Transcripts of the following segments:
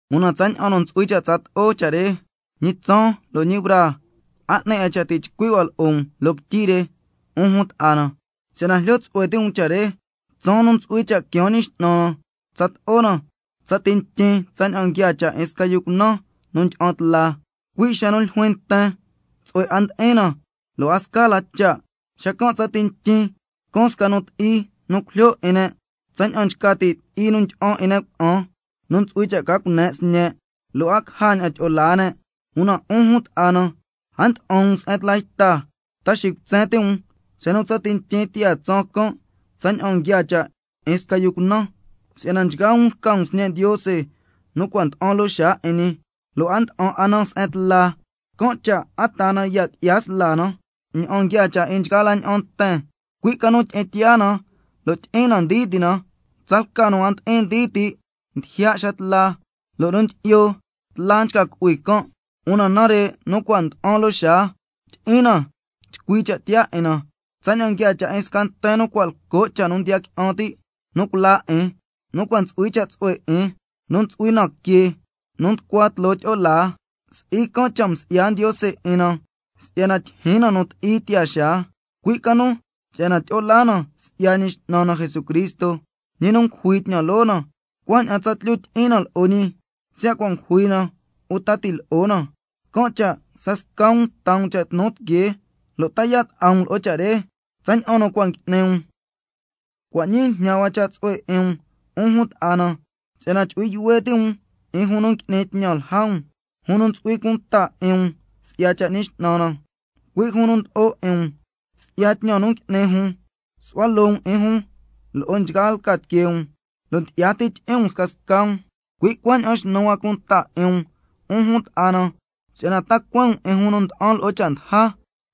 Una tsaña'an nu ntsu'hui cha' tsato'o cha' re, ñi tsaan lo' ñi braa, a 'ni 'a cha' ti' chcui' hua lo'o um loo quityi re, 'un jun ta'a na, si'yana jlyo tsu'hue ti' um cha' re. Tsaan nu ntsu'hui cha' quiaan Ñi X'nan na tsato'o na tsati ntyin tsaña'an nguiaa cha' 'in sca yu cunan nu ndyi'an tla, cui' xa nu ljuin nten: Tsu'hue 'a ndi'in na, lo' a sca la cha', xacan' tsati ntyin caan sca nu ti'i nu cujlyo 'in ne' tsaña'an nchca ti' ti'i nu ndyi'an 'in ne' cuna'an nu ntsu'hui cha' ca cune' sñe', lo' a caja ña'an tyi'o laa ne'. Una 'un jun ta'a na, a nda'an 'a um se'en tla yta, ta xicutsen ti' um xa nu tsati ntyin tiyaa tsaan can' tsaña'an nguiaa cha' 'in sca yu cunan. Si'yana nchgaa um lca um sñe' Ndiose nu cua' nda'an loo xaa 'in ñi, lo' a nda'an 'a na se'en tla. Can' cha' a taa na ya' qui'ya sla na ña'an nguiaa cha' 'in nchgaa la ña'an nten, cui' ca nu tyi'in tiyaa na lo' tyi'in na ndii ti' na. Si'yana tsalca nu a ndi'in ndii ti' ndijya' xa tla, lo' nu ndyi'yo tla nchca cu'hui can'. Una nare' nu cua' nda'an loo xaa, tyi'in na chcui cha' tiyaa 'in na, —tsaña'an nguiaa cha' 'in sca nten nu cua' lco' cha' nu ndiya qui'an ti' nu culaa 'in, nu cua' ntsu'hui cha' tsu'hue 'in, nu ntsu'hui na que lo' nducua tloo tyi'o laa—. Si'i can' cha' msi'ya Ndiose 'in na si'yana tyijyin na nu ti'i tiyaa xaa, cui' ca nu si'yana tyi'o laa na si'ya Ñi X'nan na Jesucristo, ñi nu ngujui tñan loo na, cuaña'an tsatlyu tyi'in na lo'o ñi, siya' cua' ngujui na uta ti' lo'o na. Can' cha' scasca um taa um cha' tnu tiquee lo' ta yaa' ta'a um lo'o cha' re, tsaña'an nu cua' ngui'ni um. Cua' ñii jñan hua cha' tsu'hue 'in um, 'un jun ta'a na, si'yana chu'hui yuhue ti' um 'in jun nu ngui'ni tñan lja um, jun nu ntsu'hui cunta 'in um si'ya cha' 'in Ñi X'nan na, cui' jun nu ndlo'o 'in um. Si'ya tñan nu ngui'ni jun, su'hua loo um 'in jun loo nchgaa lca tiquee um, lo' ndyi'ya ti tyi'in um scasca um. Cui' cuaña'an xnu hua cunta 'in um, 'un jun ta'a na, si'yana ta cueen um 'in jun nu nda'an lo'o cha' ndaja,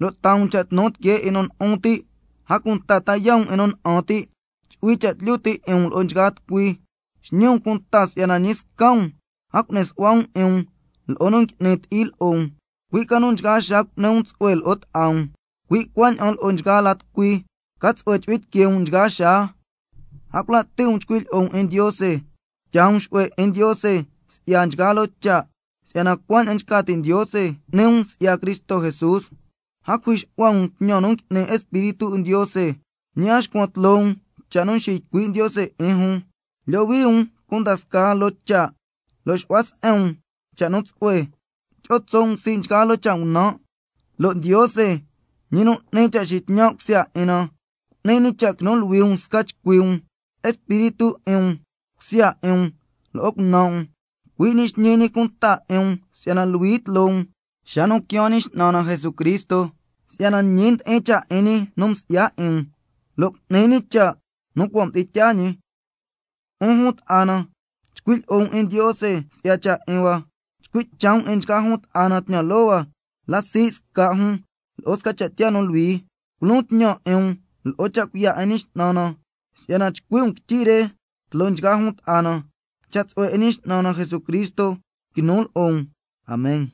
lo' taa um cha' tnu tiquee 'in nu lu'un ti', a cunta ta yaa' um 'in nu na'an ti', chu'hui cha' tlyu ti' 'in um lo'o nchgaa tucui. Xñi um cunta si'yana ñi sca um a cu'ni su'hua um 'in um lo'o nu ngui'ni ti'i lo'o um, cui' ca nu nchgaa xaa cu'ni um tsu'hue lo'o ta'a um, cui' cuaña'an lo'o nchgaa la tucui. Ca tsu'hue chu'hui tiquee um nchgaa xaa. A cula' ti' um chcui lyi'o um 'in Ndiose. A cunta tyaa um xu'hue 'in Ndiose si'ya nchgaa loo cha', si'yana cuaña'an nchca ti' Ndiose cu'ni um si'ya Cristo Jesús. A cujui xu'hua um tñan nu ngui'ni Espíritu 'in Ndiose. Ñi a xcuan tloo um scasca cha' nu nxiycui' Ndiose 'in jun. Lyohui um cunda scaa loo cha', lo' xu'hua se'en um cha' nu tsu'hue. Tyi'o tso' um sii' nchgaa loo cha' ngunan'. Lo' Ndiose, ñi nu n'ni cha' tyi'in tsu'hue na, cu'ni ñi cha' quinu luhui um sca chcui um: Espíritu 'in um, cusya 'in um, lo'o cunan' um. Cui' ñi xñi ñi cunta 'in um si'yana luhui tloo um xa nu quiaan Ñi X'nan na Jesucristo, si'yana ñi ndi'in cha' 'in ñi nu nsi'ya 'in um, lo' cu'ni ñi cha' nu cua' mdi'in tyaa ñi. 'Un jun ta'a na, chcui' lyi'o um 'in Ndiose si'ya cha' 'in hua. Chcui' cha' um 'in nchgaa jun ta'a na tñan loo hua la sii' sca' jun lo'o sca cha' tiyaa nu luhui. Culon tñan 'in um lo'o cha' cuiya' 'in Ñi X'nan na, si'yana chcui' um quityi re tloo nchgaa jun ta'a na. Cha' tsu'hue 'in Ñi X'nan na Jesucristo quinu lo'o um. Amen.